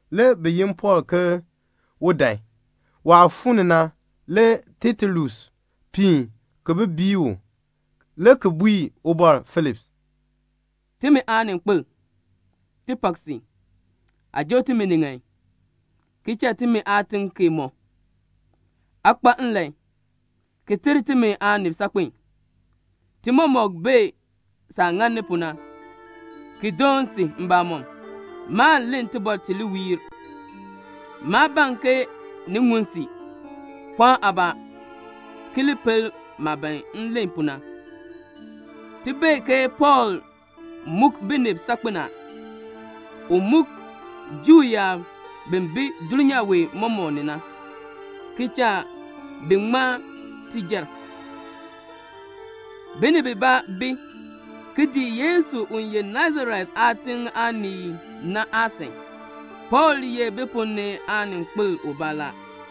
Le bi yin Pɔɔl ke un dan. Waah fuu ni na, le Tetulus piin ki bi bii u, le ki bui Ubɔr Feliks, "Timi aaninkpil, ti pak si. Aa joo timi ni ŋan, ki cha timi aatiŋ kee mɔ. Aa kpa nlan, ki ter timi aanib saakpen. Ti mɔmɔk bee saah ŋani pu na, ki doon si mbamɔm. Maan len tibɔr ti li wiir. Maa ban ke ni ŋun si. Pɔɔn aabaa, ki li pel maah ban m len pu na. Ti bee ke Pɔɔl muk binib saakpen a. U muk Juu yaab bi bi dulnyaa wee mɔmɔk ni na, ki cha bi ŋma tijar. Binib bibaa bi, ki dii Yesu u ye Nasaret aatiŋ aanii na aasan. Pɔɔl ye bi ponn ni aaninkpil ubaa la.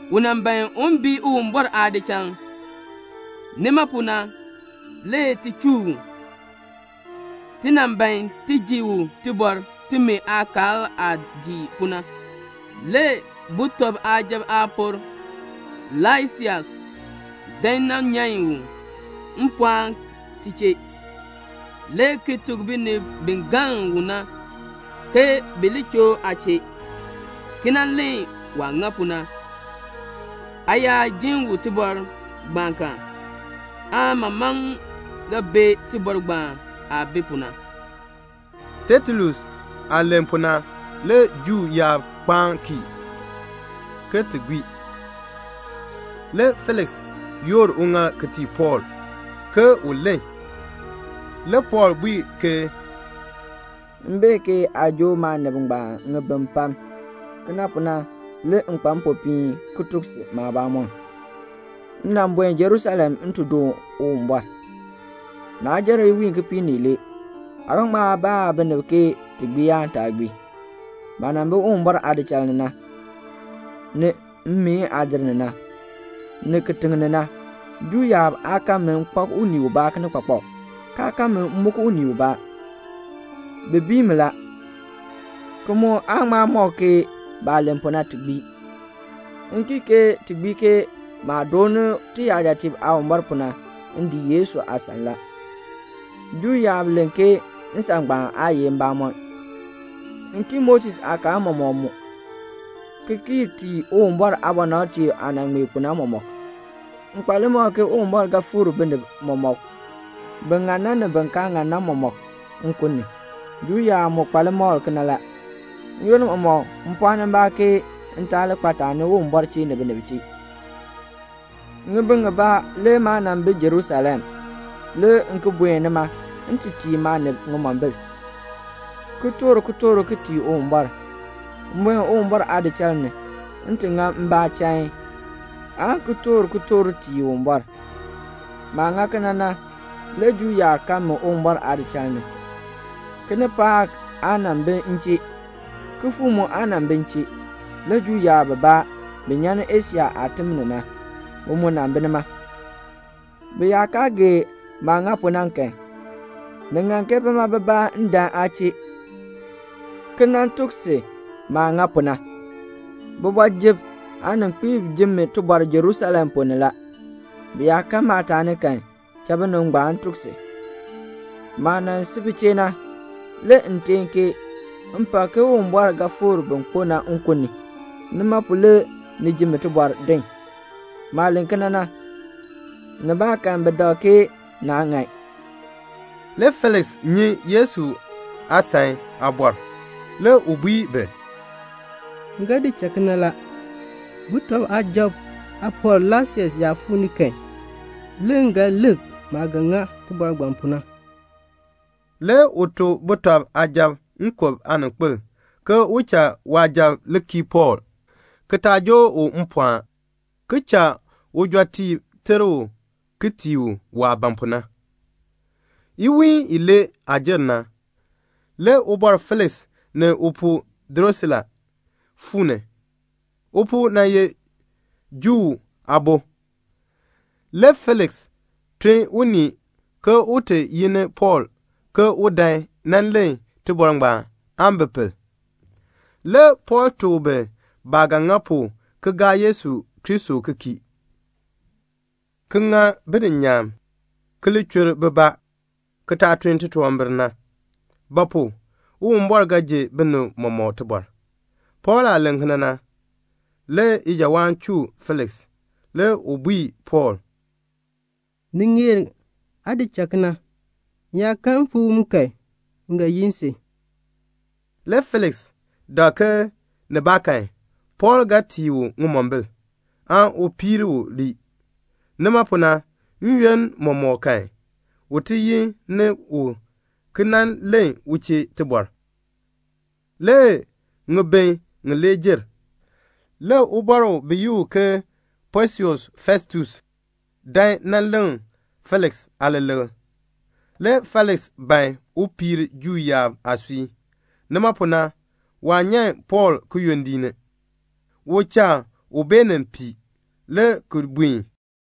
U nan ban un bii Uwumbɔr aadichal. Nima pu na le ti chuu u. Ti nan ban ti ji u tibɔr timi aakaal aah dii pu na. Le sujatiib aapor Laisias dan nan nyan u mpɔɔn ti chee, le ki tuk binib bi galn u na, ke bi li choo aa chee, ki nan len waah ŋa pu na. Aa yaa jin u tibɔr ngbaan kan, aa mamaŋ ga bee tibɔr ngbaan aah bi pu na." Tetulus aah len pu na, le Juu yaab kpaan kii, ke ti gbii. Le Feliks yoor uŋaal ki tii Pɔɔl, ke un len. Le Pɔɔl bui ke, "M bee ke aa joo maanib ngbaan ŋibin pam. Kena pu na le m kpa mpopiin ki tuk si maabamɔn. M nan buen Jerusalem m ti doon Uwumbɔr. Naa jer iwiin kipiik ni ilee. Aa ga ŋma baa binib ke ti gbii aan taa gbii. Maah nan bi Uwumbɔr aadichal ni na, ni mmeen aadir ni na, ni kitiŋ ni na, Juu yaab aa kan mi m kpak unii ubaa kinikpakpak, kaa kan mi m muk unii ubaa. Bi bii mi la, ki mu aa ŋma mɔk ke baah len pu na ti gbii. M kii ke ti gbii ke maah dooni tiyajatiib Aawumbɔr pu na, m dii Yesu aasan la. Juu yaab len ke nsan ngbaan aa ye mbamɔn. M kii Moses aakaal mɔmɔk mu, ki kii tii Uwumbɔr aabɔnabtiib aah nan ŋmee pu na mɔmɔk. M kpa limakl ke Uwumbɔr ga fikr binib mɔmɔk, bin ŋan na, ni bin kaa ŋan na mɔmɔk, nkun ni. Juu yaab mu kpa limakl kena la. N-yoonn mɔmɔk m pɔɔni mbaa ke m taa li kpa taani Uwumbɔr chee ni binib chee. "Ŋibin ŋibaa le maa nan bi Jerusalem. Le m ki buen nima m ti tii maanib ŋimombil, ki toor kitork ki tii Uwumbɔr. M buen Uwumbɔr aadichal ni, m ti ŋa mbaa chain, aan ki toor kitork tii Uwumbɔr. Maah ŋa kena na, le Juu yaab kan mi Uwumbɔr aadichal ni. Kinipaak aa nan bi m chee. Kifuuk mu aa nan bi m chee. Le Juu yaab bibaa, bi nyan ni Asia aatim ni na, bi mu nan bi nima. Bi yaa kaa gee maah ŋa pu na kan, ni ŋan ke bima bibaa dan aa chee, ki nan tuk si maah ŋa pu na. Kooti ni aaninkpiib jin mi tibɔr Jerusalem ponn ni la. Bi yaa kan maataani kan, cha binib ngbaan tuk si. Maah nan si bi chee na, le m teen ke 'M pak ke Uwumbɔr ga fikr bin kpo na nkun ni. Nima pu le ni ji mi tibɔr din.' Maah len kena na, nibaakan bi dak ke naa ŋan." Le Feliks nyi Yesu aasan aabɔr. Le u bui bi, "M ga di cha kena la. Sujatiib aapor Laisias yaa fuu ni kan, le m ga lik maah ga ŋa tibɔr ngbaan pu na." Le u tuk sujatiib nkub aaninkpil ke u cha waasujatiib li kii Pɔɔl, ki taa joo u mpɔɔn, ki cha ujɔtiib ter u ki tii u waah ban pu na. Le iwiin ibaa jer. Le Ubɔr Feliks ni upuu Drusila fuu ni. Upuu nan ye Juu aabo. Le Feliks tun unii ke un ti yi ni Pɔɔl ke un dan nan len tibɔr ngbaan aan bi pel. Le Pɔɔl tuk bi baah ga ŋa pu ki gaa Yesu Kristo ki kii, ki ŋa bininyaan, ki li chur bibaa, ki taa tun titunwambir; ba pu? Uwumbɔr ga ji binib mɔmɔk tibɔr. Pɔɔl aah len kena na, le ijawaan chuu Feliks. Le u bui Pɔɔl, "Ni ŋeer aa di cha kena. M yaa kan mfaawom kan, m ga yin si." Le Feliks dak ke nibaakan Pɔɔl ga tii u ŋimombil, aan u piir u lii. Nima pu na, n-yoonn mɔmɔk kan, u ti yi ni u ki nan len u chee tibɔr. Le ŋibin ŋilee jer. Le ubɔr bi yi u ke Posius Festus dan nan leŋ Feliks aaleleŋ. Le Feliks ban un piir Juu yaab aasui. Nima pu na, waa nyan Pɔɔl kiyondiik ni. U cha u beenin pii, le ki buen.